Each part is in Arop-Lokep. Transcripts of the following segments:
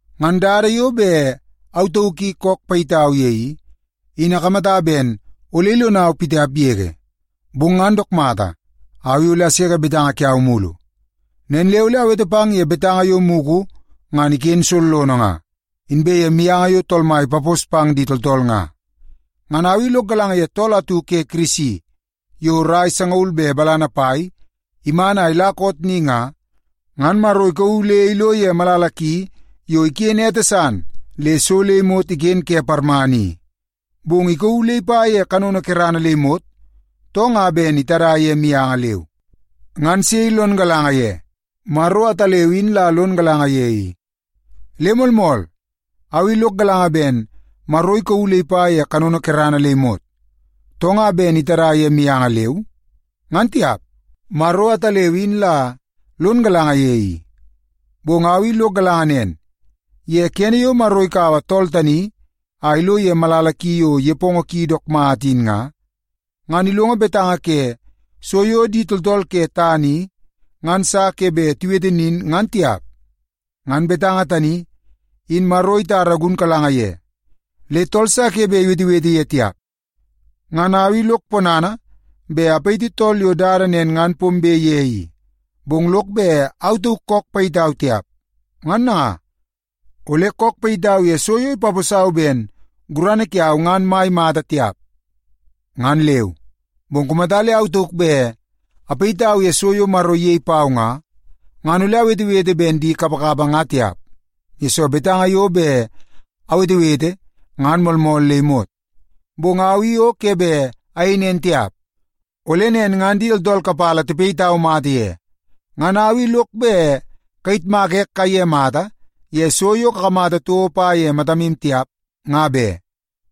Ngan dada yo bet au tauk kook payitau ye i, in akamata ben ole ilonau pitiap yege, bong ngan dook mata, au i ole aseke betanga kiau mulu. Nen le ole awete pang ye betanga yo mugu ngan iken sollono nga, inbe ye mianga yo Tool Mai ipapos pang di tooltool nga. Ngan au i lok galanga ye tool atu ke Kirisi yo rai sangaul be balana pai iman a ila koot ni nga, ngan Maro ikauu le ilo ye malala ki yo iken ete san le so le imot iken ke parmana i. Bong ikauu le ipa ye kanono kerana le imot, too nga ben itada ye mianga leu, ngan sei lon galanga ye. Maro ataleu in la lon galanga ye i. Le moolmool, au i lok galanga ben Maro ikauu le ipa ye kanono kerana le imot, too nga ben itada ye mianga leu, ngan tiap. Maro ataleu in la lon galanga ye i. Bong au i lok galanga nen, ye kene yo Maro ikaua tool tani a ilo ye malala ki yo nepongo ki dook mata in nga, ngan ilongo betanga ke so yo di tooltool ke tana i ngan sa ke bet iwete nin ngan tiap. Ngan betanga tani, in Maro itara gunkalanga ye, le tool sa ke bet iwetewete ye tiap. Ngan au i lok ponana bet apayiti tool yo dada nen ngan pombe pang ye i, bong lok bet au tauk kook payitau tiap. Ngan nanga, ole kook payitau ye so yo ipaposau ben gurana kiau ngan mai mata tiap, ngan leu. Bong kumata le au tauk bet apayitau ye so yo Maro iyei pau nga, ngan ole awetewete ben di kapakapa nga tiap, yesoo betanga yo bet awetewete ngan moolmool le imot. Bong au i o ke bet ayei nen tiap, ole nen ngan di tooltool kapala tipayitau mata ye. Ngan au i lok bet kayitmaka ek kaiye mata ye so yo kakamata toko pa ye matamu tiap, nga be,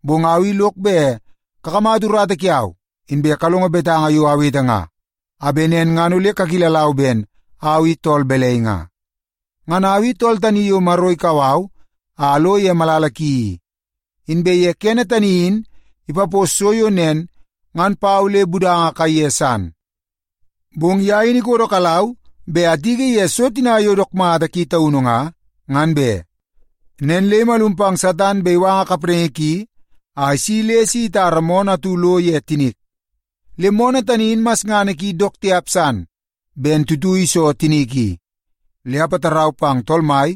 bong au i lok bet kakamata urata kiau inbe kalongo betanga yo awete nga, a bet nen ngan ole kakilalau ben au i tool balai nga. Ngan au i tool tani yo Maro ikau au a alo ye malala ki i, inbe ye kene tani in ipapos so yo nen ngan pau le budanga kaiye san i. Bong ye in ikodokalau bet atiki ye so tina yo dook mata ki taunu nga, ngan be. Nen le imalum pang Satan bet iwanga kapraingi ki a isi le si itara moonoo atu lo ye tinik. Le moonoo tani in masngana ki dook tiap san ben tuitui la iso tinik i. Le apatarau pang Tool Mai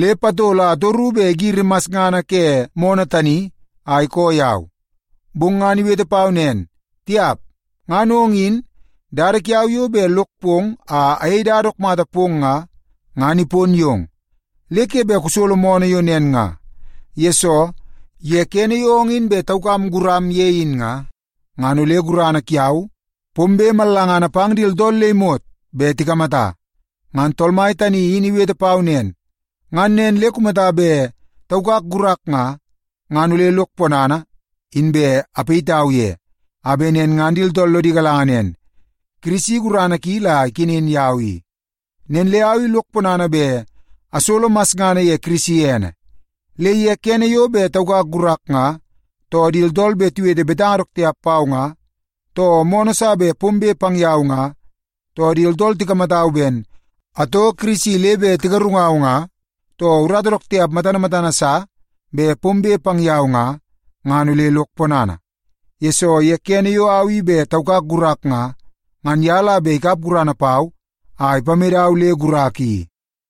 le patol a atoru bet igiri masngana ke moonoo tani a ikoo yau. Bong ngan iwete pau nen, “Tiap! Ngan ong in, dada kiau yo bet lok pong a ayei dada dook mata pong nga, ngan ipon yong, le ke bet kusolo moonoo yo nen nga. Yesoo, ye kene yo ong in bet taukam guram ye in nga, ngan ole gurana kiau pombe mallangana pang di tooltool le imot bet tikamata.” Ngan Tool Mai tani in iwete pau nen, ngan nen le kumata bet taukak gurak nga, ngan ole lok ponana inbe apayitau ye, a bet nen ngan di tooltool lodi galanga nen, Kirisi gurana ki la ikenen yau i. Nen le au i lok ponana bet asolo masngana ye Kirisi ene. Le ye kene yo bet taukak gurak nga, too di tooltool bet tiwete betanga dook tiap pau nga, too moonoo sa bet pombe pang yau nga, too di tooltool tikamatau ben atoo Kirisi le bet tigarungau nga, too urata dook tiap matana matana sa bet pombe pang yau nga, ngan ole lok ponana. Yesoo, ye kene yo au i bet taukak gurak nga, ngan ye la bet ikap gurana pau a ipamedau le gurak i.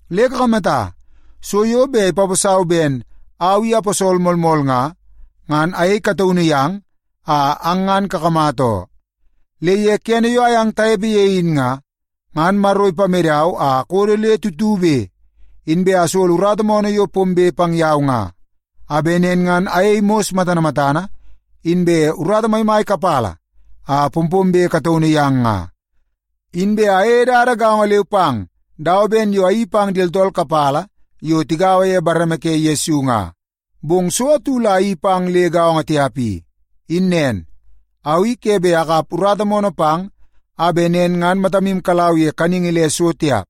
Le kakamata, so yo bet ipaposau ben au i aposol moolmool nga, ngan ayei kataunu yang a ang ngan kakamata oo. Le ye kene yo ayang tanepe ye in nga, ngan Maro ipamedau a akodo le tutube, inbe asolo urata moonoo yo pombe pang yau nga, a bet nen ngan ayei mos matana matana, inbe urata maimai kapala a pompombe kataunu yang nga. Inbe ayeie dada gaongo leu pang dawa ben yo ayeii pang di tooltool kapala yo tigaua ye bareme ke Yesu nga. Bong so atu la ayeii pang le gaongo tiap i, in nen, au i ke bet akap urata moonoo pang a bet nen ngan matamu kalau ye kaningi le so tiap.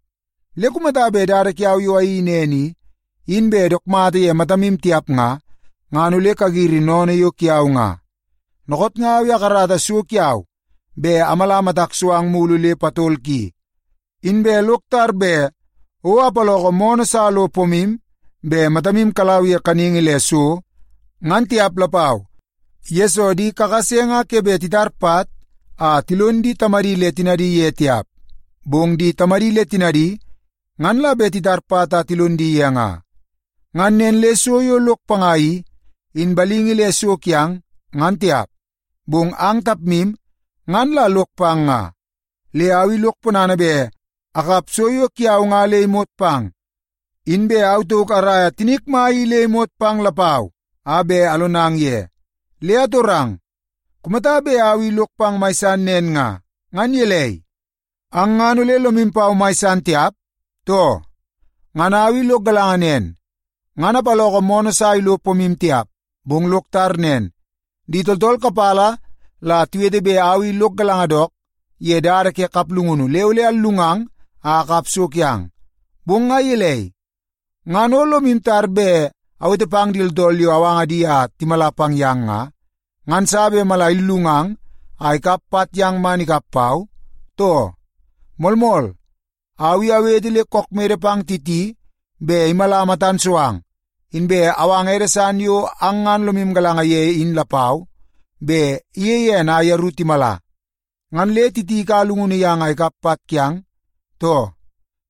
Le kumata bet dada kiau yo ayeii nen i, in bet dook mata ye matamu tiap nga, ngan ole kagiri sennene yo kiau nga. Dookoot nga au i akarata so kiau bet amala matak so ang mulu le patol ki. Inbe lok tar bet o apaloko moonoo sa lo pomu bet matamu kalau ye kaningi le so, ngan tiap lapau, yesoo di kakase nga ke bet titar pat a tilon di tamadi le tinadi ye tiap, bong di tamadi le tinadi ngan la bet titar pat a tilon di ye nga. Ngan nen le so yo lok panga i, in balingi le so kiang, ngan tiap, bong ang tapmu ngan la lok pang nga. Le au i lok ponana bet akap so yo kiau nga le imot pang, inbe au tauk araia tinik mai i le imot pang lapau a bet alonang ye. Le atorang, kumata bet au i lok pang mai san nen nga, ngan gelei, ang ngan ole lomu pau mai san tiap, too? Ngan au i lok galanga nen, ngan apaloko moonoo sa ilo pomu tiap. Bong lok tar nen, di tooltool kapala la tiwete bet au i lok galanga dook ye dada ke kaplungunu le ole allungang a akap so kiang. Bong nga gelei, ngan o lomu tar bet awete pang di tooltool yo awanga di a timala pang yang nga, ngan sa bet mala illungang a ikap pat yang man ikap pau, too? Moolmool, au i awete le kook mede pang Titi bet imala matan so ang, inbe awanga ede san yo ang ngan lomu galanga ye in lapau bet iyei ene a yeru timala. Ngan le Titi ikaua llungunu yang a ikap pat kiang, too?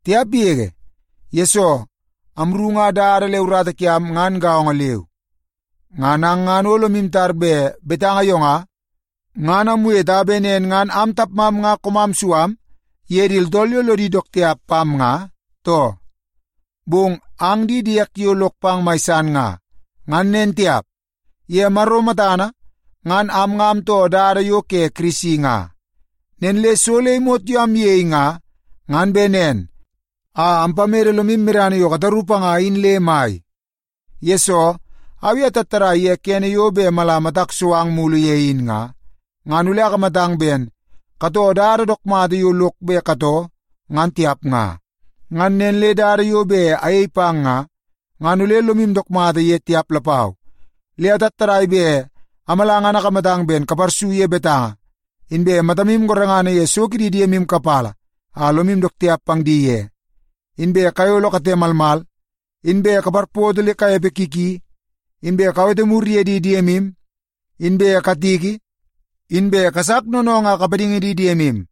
Tiap yege! Yesoo, amru nga dada le urata kiam ngan gaongo leu. Ngan ang ngan o lomu tar bet betanga yo nga, ngan amwete a bet nen ngan am tapmam nga koomam su am ye di tooltool yo lodi dook tiap pam nga, too? Bong ang di diek yo lok pang mai san nga, ngan nen tiap, ye Maro matana ngan am nga amtoo dada yo ke Kirisi nga. Nen le so le imot yo amyei nga, ngan bet nen a ampamede lomu medana yo kataru panga in le mai. Yesoo, au i atattadai ye kene yo bet mala matak so ang mulu ye in nga, ngan ole akamatang ben katoo dada dook mata yo lok bet katoo ngan tiap nga. Ngan nen le dada yo bet ayei pang nga, ngan ole lomu dook mata ye tiap lapau. Le atattadai bet amala ngan akamata ben kaparsu ye betanga, inbe matamu gorengana ye so kidi diemu kapala a lomu dook tiap pang di ye, inbe kayolo kate malmal, inbe kaparpoto le kanepe ki ki, inbe kawete mur ye di diemu, inbe katiki, inbe kasak noonoongoo a kapadingi di diemu.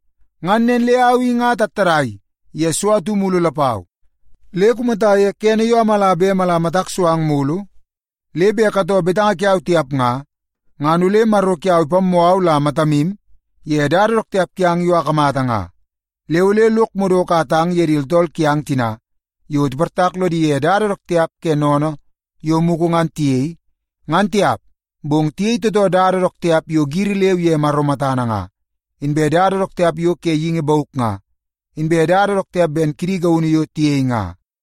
Ngan nen le au i nga atattadai ye so atu mulu lapau. Le kumata ye kene yo amala bet mala matak so ang mulu, le bet katoo betanga kiau tiap nga, ngan ole Maro kiau ipammoo au la matamu ye dada dook tiap kiang yo akamata nga. Le ole lok madoko a atang ye di tooltool kiang tina yo tiportak lodi ye dada dook tiap ke sennene yo mugu ngan tiyei, ngan tiap, bong tiyei tootoo dada dook tiap yo giri leu ye Maro matana nga, inbe dada dook tiap yo ke geingi bauk nga, inbe dada dook tiap ben kidi gaunu yo tiyei nga.